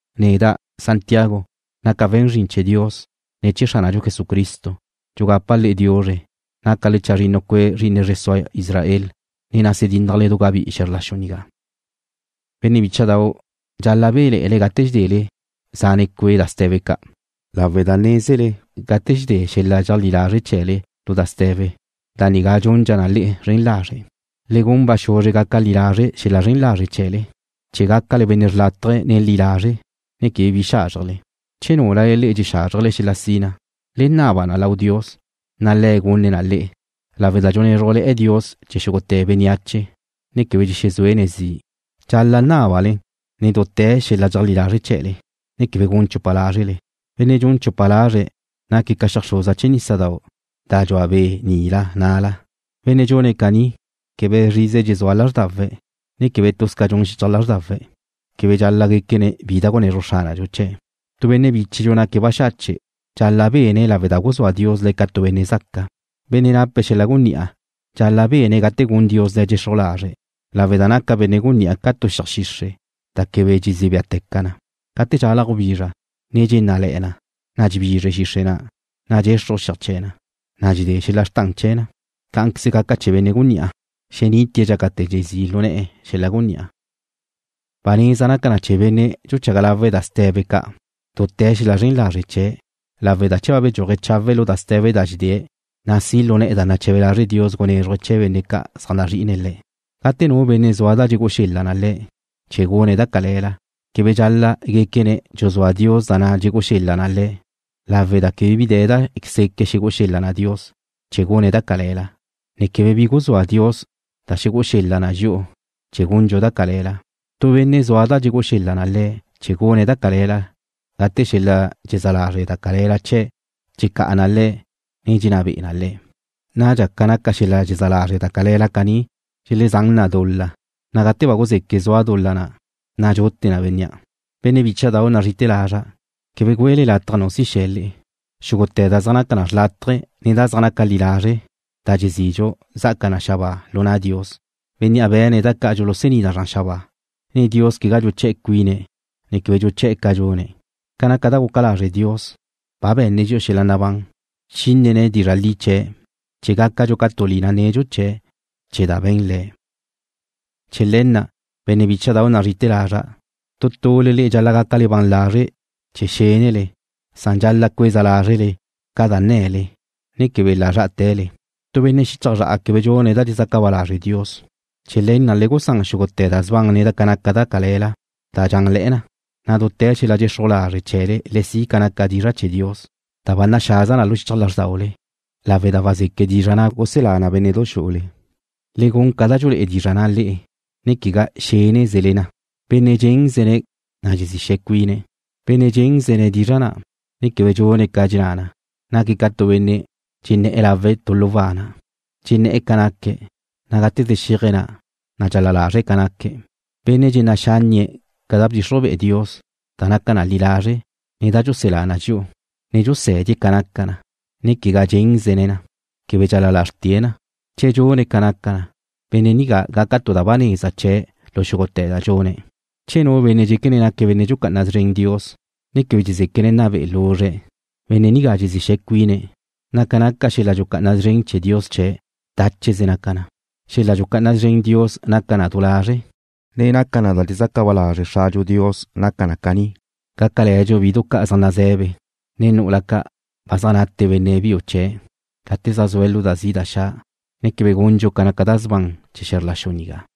Neda', Jacobo, naca' we̱n zrin chee̱ Dios, ne chee̱ Xránadxu Jesucristo. Dxugapa' le'e diuzre. Nácale chazrinnu cue' zri'ine zre sua Israel, ne nase dínnajle du gabí'i xe̱zr la xu nigá. Benne' bícha'dau', dxal-la' béle̱'e̱le gate dxedele zane cue' da ste̱be ca', lawe' da nézele gate dxedé xel-la' dxeajlí lazre' chee̱le lu da ste̱be, da nigá dxundxa na le'e zren lazre'. Le gun ba xuzre gaca li lazre' xel-la' zren lazre' chee̱le chee̱ gácale benne' xrlátaje̱ ne li lazre', ne quebe bi xázrjele. Che núlale le'e dxexázrjele xel-la' sina, le naba na lau Dios, na' Le̱' gunne̱' na le'e, lawe' da dxunézrujle̱'e̱ Dios chee̱ xúgute̱ bénneache, ne quebe dxexezúene̱' zi'. Dxal-la' nábale nen dute̱ xel-la' dxeajlí lazre' chee̱le, ne quebe gun chupa lázrele. Benne' dxun chupa lazre̱' naque̱' ca xeajxruza chee̱ nísadau' da dxua be' nila na'la. Benne' dxune̱' caní, ne quebe zrize dxezúa lázrdawe̱', ne quebe tuz ca dxun xichaj lázrdawe̱' quebe dxal-la' guéquene̱' bi da xunezruj Xránadxu chee̱'. Tu benne' bíchedxu naque̱' baxache' dxal-la' bene̱' lawe' da guzúa Dios le̱' ca tu benne' zaca. Benne' nape̱' xel-la' gunní'a dxal-la' bene̱' gate gun Dios le̱' dxexruj lazre' lawe' da naca benne' gunní'a ca tu xiaj xixre' da quebe dxezí béateca na. Gate dxalaj gubizra, ne dxennále̱'e̱ na, na' dxebizre xixre' na', na' dxexruj xiaj chee̱ na, na' dxedé xel-la' xrtan chee̱ na. Cá'anqueze gaca chee̱ benne' gunní'a, xenitie̱' dxácate̱ na' dxezí' lu ne̱'e̱ xel-la' gunní'a. Ba neza naca na chee̱ benne' dxuchaga lawe̱' da ste̱be ca' dute̱ xel-la' zren lazre' chee̱', lawe' da che ba bedxúaje̱' chawe' lu da ste̱be da dxedée̱', na' si' lu ne̱'e̱ da nache̱be lazre' Dios gunézruje̱' chee̱ benne' ca' zaj nazri'ine̱' Le̱'. Gate nu benne' zua da dxegú'u xel-la' na le̱' chee̱ gune̱' da cale̱la, quebe dxal-la' guéquene̱' dxuzúa Dios da na' dxegú'u xel-la' na le̱', lawe' da quebe bi de̱ da seque' xegú'u xel-la' na Dios chee̱ gune̱' da cale̱la, ne quebe bi guzúa Dios da xegú'u xel-la' na dxi'u chee̱ gundxu da cale̱la. Tu benne' zua da dxegú'u xel-la' na le̱' chee̱ gune̱' da cale̱la gate xel-la' dxezá lazre' da cale̱la chee̱' dxecá'a na le̱', ne dxenná be'e na le̱'. Nadxa ca naca xel-la' dxezá lazre' da cale̱la caní dxuluzán na dul-la, na' gate ba guzeque' zua dul-la na', na' dxute na bénnea'. Benne' bícha'dau' nazri'ite̱ lazra', quebe güele lataj nu si xe̱ le'e. Xúgute̱ da zaj naca xrlátaje ne da zaj naca li lazre' da dxezidxu zá'aca na xabáa lu na' Dios, Bénnea' be̱ne̱' da ca' dxulusení na zran xabáa. Dios quegá dxuchá cuine̱', ne quebe dxuché̱'e̱ ca dxune̱'. Ca naca da guca lazre' Dios, ba be̱nne̱' dxi'u xel-la' nabán. Bchínene̱' dizra' li chee̱', chee̱ gácadxu ca tu lina nedxu chee̱', chee̱ da ba be̱n Le̱'. Chee̱ le̱ na', benne' bícha'dau' nazri'ite̱ lazra', tu tule le'e dxal-la' gácale ban lazre' chee̱ xénele, san dxal-la' cueza lázrele ca da nne̱le ne quebe la' zrá'ate̱le. Tu benne' xichaj zra'a quebe dxune̱' da dxezaca ba lazre' Dios. Chee̱ le̱ na', le gusán xúgute̱ da sban ne ca naca da cale̱la da dxanle̱'e̱ na, na' dute̱ xel-la' dxexruj lazre' chee̱le le si' ca naca dizra' chee̱ Dios da ba naxaza na lu xichaj lázrdaule, lawe' da wazeque' dizra' na' guselá na bénne'du xu'ule. Le gun ca da dxulé'e dizra' na' le'e, ne quegá xénezele na. Benne' dxénzene̱' na dxezí xe̱ze cuine̱'. Bénnea' dxénzene̱' dizra' na', ne quebe dxune̱' ca dxenná na, naque̱' ca tu benne' dxenné̱'e̱ lawe̱' tu lu wana'. Dxenné̱'e̱ ca naque̱', na' gate ze xeajze̱' na', na' dxal-la lazre̱' ca naque̱'. Benne' dxenná' xánnie̱' ca da bdxixruj be'e Dios da naca na li lazre', ne da dxuselá na dxi'u, ne dxusé̱die̱' ca naca na, ne quegá dxénzene̱' na, quebe dxal-la lazrte̱' na. Che dxune̱' ca naca na, benne' nigá gaca tu da ba neza chee̱' lu xúgute̱ da dxune̱'. Che nu benne' dxéquene̱' naque̱' benne' dxucá'ana szren Dios, ne quebe dxezéquene̱' nna be'ene̱' luzre̱', benne' nigá dxezí xe̱ze cuine̱', na' ca naca xel-la' dxucá'ana szren Dios chee̱' dácheze naca na. Xel-la' dxucá'ana szren Dios da naca na du lazre', ne da naca na da dxezaca ba lazre' Xradxu Dios naca na caní: Gácale̱dxu bidu ca' zaj naze̱be, ne nu'ula ca' ba zaj nate benne' biu chee̱' gate zaj zue̱' lu da zi' da xa', ne quebe gundxu ca naca da sban chee̱ xe̱zr la xu nigá.